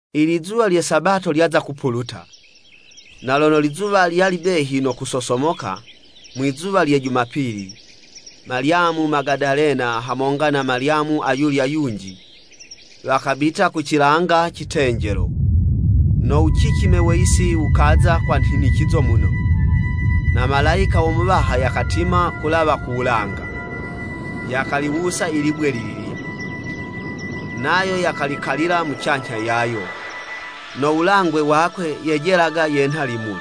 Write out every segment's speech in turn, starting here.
Ilizuwa lye Sabato lyaza kupuluta, na lono lizuwa lyali behi no kusosomoka mwizuwa lye Jumapili, Malyamu Magadalena hamonga na Malyamu ayulya yunji, wakabita ku cilanga citenjelo. No wucicime we yisi wukaza kwa nhinicizo muno, na Malayika wo Muwaha yakatima ku wulawa ku wulanga, yakaliwusa i libwe lililya, nayo yakalikalila mucanyha yayo. No wulangwe wakwe, yejelaga yenha limuli,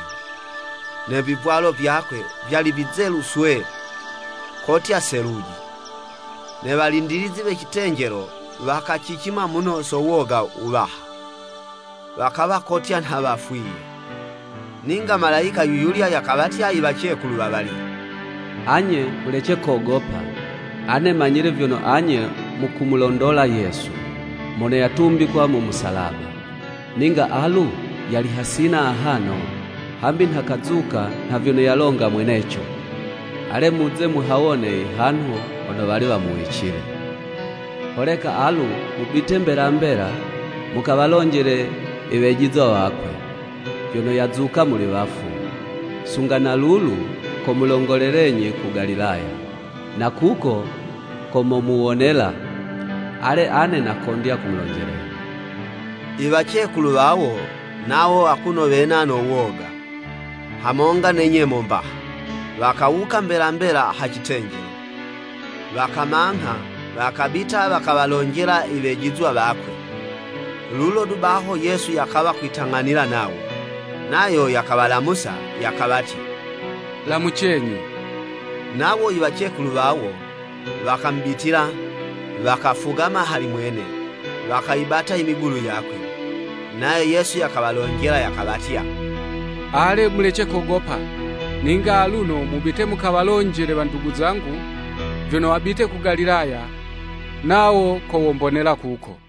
ne vivwalo vyakwe, vyali vizelu swee, kotya seluji. Ne walindilizi we citenjelo wakacicima muno so woga wuwaha, wakawa kotya nha wafwiye. Ninga Malayika yuyulya yakawatya i wacekulu wawalya, “Anye, mulece kogopa! Ane manyile vyono anye mukumulondola Yesu, mono yatumbikwa mu musalaba. Ninga alu, yali hasina ahano, hambi nha kazuka nha vyono yalonga mweneco. Ale, muze muhawone ihanhu hono wali wamuwicile. Holeka alu, mubite mbela mbela, mukawalonjele iwejizwa wakwe, vyono yazuka muli wafu, sunga na lulu, komulongolelenyi ku Galilaya, na kuko ko momuwonela. Ale, ane nakondya kumulonjelenyi.” I wacekulu wawo, nawo akuno wena no woga, hamonga ne nyemo mbaha, wakawuka mbela mbela ha citenjelo, wakamangha, wakabita wakawalonjela i wejizwa wakwe. Lulo du baho Yesu yakawa kwitang'anila nawo. Nayo yakawalamusa, yakawatya, “Lamucenyi.” Nawo i wacekulu wawo, wakamubitila, wakafugama hali mwene, wakayibata imigulu yakwe. Nayo Yesu yakawalonjela yakawatya, “Ale, mulece kogopa! Ninga aluno mubite mukawalonjele wandugu zangu, vyono wabite ku Galilaya, nawo ko wombonela kuko.”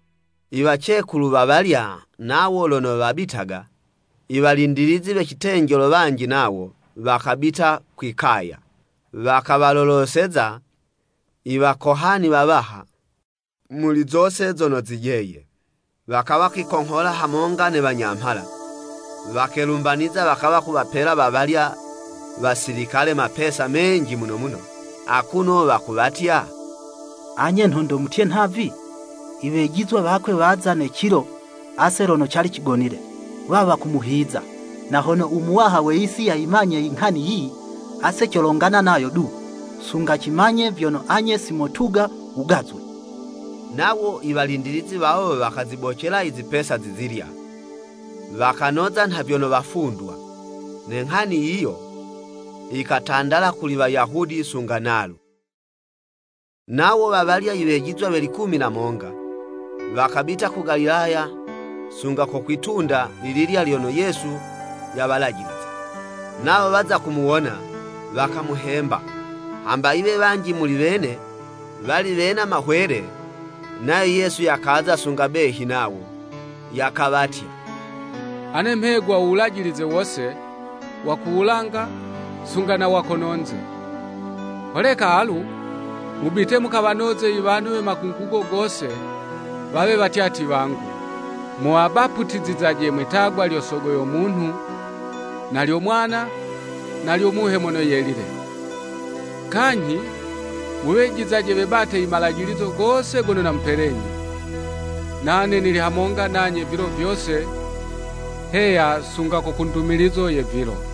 Iwacekulu wawalya nawo lono wabitaga, i walindilizi we citenjelo wanji nawo, wakabita kwi'kaya, wakawaloloseza i wakohani wawaha, muli zose zono zijeye. Wakawa kwikonghola hamonga ne wanyamhala, wakelumbaniza wakawa kuwapela wawalya wasilikale mapesa menji muno muno, akuno wakuwatya, “Anye nhondo mutye nhavi, ‘Iwejizwa wakwe waza ne cilo ase lono cali cigonile, wawa kumuhiza.’ Na hono u muwaha we yisi yayimanye inghani yiyi, ase colongana nayo du, sunga cimanye vyono anye si motuga wugazwe.” Nawo i walindilizi wawo wakazibocela i zipesa zizilya, wakanoza nha vyono wafundwa. Ne nghani yiyo, yikatandala kuli Wayahudi sunga nalu. Nawo wa walya iwejizwa we likumi na monga, wakabita ku Galilaya sunga ko kwi'tunda lililya lyono Yesu yawalajiliza. Nawo waza kumuwona, wakamuhemba, hamba yiwe wanji muli wene, wali wena mahwele. Nayo Yesu yakaza sunga behi nawo, yakawatya, “Ane mhegwa u wulajilize wose, wa ku wulanga, sunga na wa kono'nze. Holeka, alu, mubite, mukawanoze i wanhu we makungugo gose, wawe watyatyi wangu, muwabaputizizaje mwitagwa lyo Sogo yo Munhu na lyo Mwana, na lyo Muhe Mono Yelile. Kanyhi, muwejizaje, webate i malajilizo gose gono namupelenyi. Nane nili hamonga nanye vilo vyose, heya, sunga ko ku ndumilizo ye vilo.”